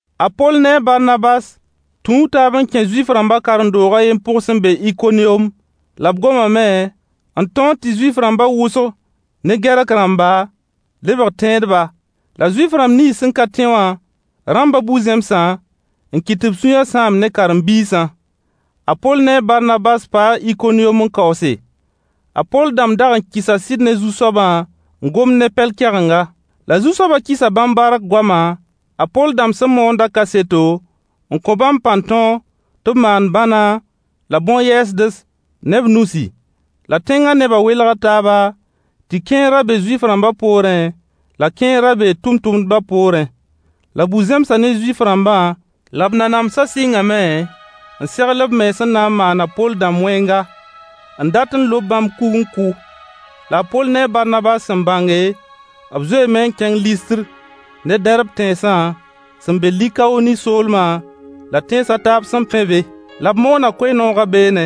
A Poll ne a Barnabas tũu taab n kẽ Zuif-rãmba karen-doog a yen pʋg sẽn be Ikoniyom, la b gomame n tõog tɩ Zuif-rãmba wʋsg ne Gɛrk-rãmba lebg tẽedba. La Zuif-rãmb nins ka tẽ wã rãmba bu-zẽmsã n kɩt tɩ b sũyã sãam ne karen-biisã. A Poll ne a Barnabas paa Ikoniyom n kaoose. A Poll dãmb daag n kɩsa sɩd ne Zu-soabã n gomd ne pɛl-kɛgenga. La Zu-soaba kɩsa bãmb bark goama a Poll dãmb sẽn moondã kaseto n kõ bãmb pãn-tõog tɩ b maan bãna la bõn-yɛɛsds ne b nusi. La tẽnga neba welga taaba, tɩ kẽer ra be Zuif-rãmba poorẽ la kẽer ra bee tʋmtʋmdba poorẽ. La bu-zẽmsa ne Zuif-rãmba la b nanamsa sɩngame n segl b mens n na n maan a Poll dãmb wẽnga, n dat lob bãmb kug n kʋ. La a Poll ne a Barnabas sẽn bãnge, b zoeeme n kẽng Listr ne Dɛrb tẽnsã, sẽn be Likaoni soolma, la tẽns a taab sẽn pẽ be. La b moona koe-noogã beene.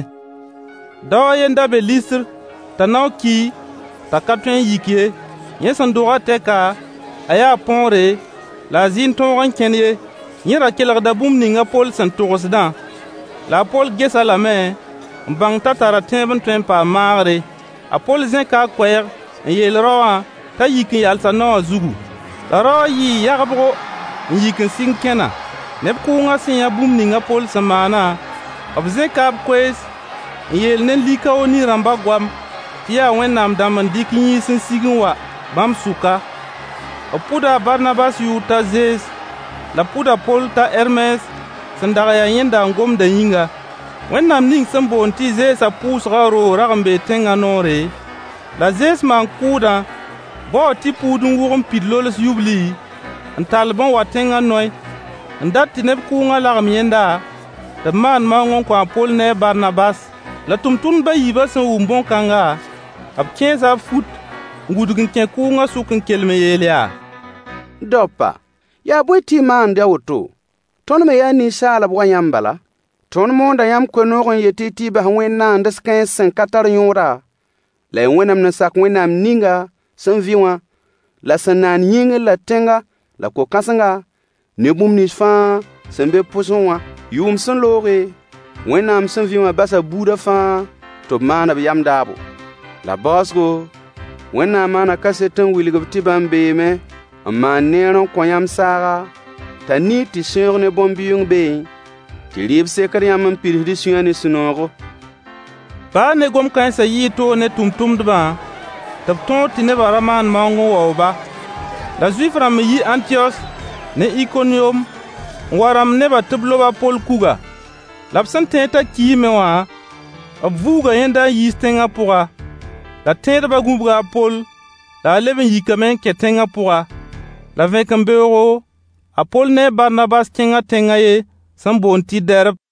Dao a ye n da be Listr t'a nao ki t'a ka tõe n yik ye. Yẽ sẽn dogã tɛka, a yaa põore la a zɩ n tõog n kẽn ye. Yẽ ra kelgda bũmb ninga a Poll sẽn togsdã. La a Poll ges-a lame n bãng t'a tara tẽeb n tõe n paam maagre. A Poll Zẽka a Koɛɛg n yeel rao wã t'a yik n yals a nao wã zugu. La rao wã yɩɩ yagbgo n yik n sɩng kẽna. Neb kʋʋnga sẽn yã bũmb ninga a Poll sẽn maana, b zẽka b koees n yeel ne Likaoni-rãmba goam tɩ yaa Wẽnnaam dãmb n dɩk yĩns n sig n wa bãmb sʋka. B pʋda a Barnabas yʋʋr t'a Zees la b pʋd a Poll t'a Hɛrmes sẽn dag n ya yẽnda n gomda yĩnga. Wẽnnaam ning sẽn boond tɩ Zeesã pʋʋgã roog rag n bee tẽnga noore, la zees maan-kʋʋdã baoo tɩ-puud n wʋg n pid lols yubli n tall-b n wa tẽnga yoy n dat tɩ neb kʋʋngã lagem yẽnda tɩ b maan maoong n kõ a Poll ne Barnabas. La tʋmtʋmdb a yiibã sẽn wʋm bõn-kãnga, b kẽesa b fut n wudg n kẽ kʋʋngã sʋk n kelem n yeel yaa: Daopa, yaa bõe tɩ y maand a woto? Tõnd me yaa ninsaalb wa yãmb bala. Tõnd moonda yãmb koe-noog n yet-y tɩ y bas wẽnd-naands-kãens sẽn ka tar yõoda la y wẽnemd n sak Wẽnnaam ninga sẽn vɩ wã la sẽn naan yĩngr la tẽnga la ko-kãsenga ne bũmb nins fãa sẽn be b pʋgẽ wã. Yʋʋm sẽn looge, Wẽnnaam sẽn vɩ wã basa buudã fãa tɩ b maan b yam daabo. La baoosgo, Wẽnnaam maana kaset n wilg-b tɩ bãmb beene n mam neer n kõ yãmb saaga t'a niid tɩ sẽoog ne bõn-bɩʋʋng beẽ tɩ rɩɩb sekd yãmb n pids y sũyã ne sũ-noogo. Baa ne gom-kãensã, yɩɩ toog ne tʋmtʋmdbã tɩ b tõog tɩ neba ra maan maoong n waoog-ba. La Zuif-rãmb n yi Ãntiyos ne Ikoniyom n wa n rãmb nebã tɩ b lob a Poll kuga. La b sẽn tẽed t'a kiime wã, b vuuga yẽnda n yiis tẽngã pʋga. La tẽedba gũbga a Poll la a leb n yikame n kẽ tẽnga pʋga. La vẽkembeoogo, a Poll ne a Barnabas kẽnga tẽnga a yen sẽn boond tɩ Dɛrb.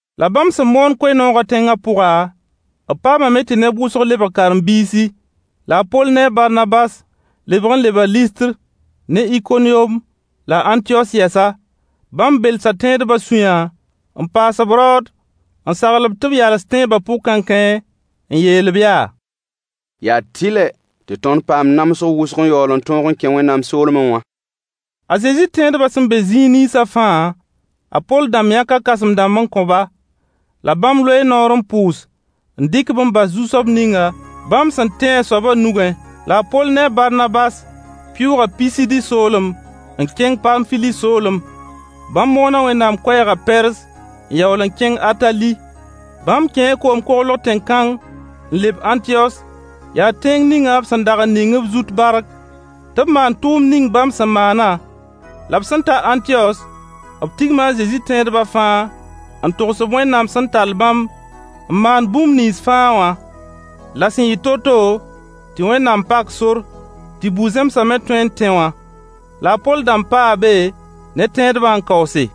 La bãmb sẽn moon koe-noogã tẽng pʋga, b paamame tɩ neb wʋsg lebg karen-biisi. La a Poll ne a Barnabas lebg n leba Listr ne Ikoniyom la Ãntiyos yɛsa. Bãmb belsa tẽedba sũyã n paas-b raood n sagl-b tɩ b yals tẽeba pʋg kãenkãe n yeel-b yaa: Yaa tɩlɛ tɩ tõnd paam namsg wʋsg n yaool n tõog n kẽ Wẽnnaam soolme wã. A Zezi tẽedba sẽn be zĩig ninsã fãa, a Poll dãmb yãka kãsem-dãmb n kõ-ba. La bãmb loee noor n Pʋʋs n dɩk-b n bas Zu-soab ninga bãmb sẽn tẽ a soaba nugẽ. La a Poll ne a Barnabas pɩʋʋga Pisidi soolem n kẽng Paamfili soolem. Bãmb moona Wẽnnaam koɛɛgã Pɛrz n yaool n kẽng Atali. Bãmb kẽ koom-koglg tẽn-kãng n leb Ãntiyos, yaa tẽng ninga b sẽn dag n ning b zut bark tɩ b maan tʋʋmd ning bãmb sẽn maana. La b sẽn ta Ãntiyos b tigma a Zezi tẽedba fãa n togs-b Wẽnnaam sẽn tall bãmb n maan bãmb bũmb nins fãa wã. La sẽn yɩ to-to tɩ Wẽnnaam pak sor tɩ bu-zẽmsa me tõe n tẽ wã. La a Poll dãmb paa be ne tẽedbã n kaoose.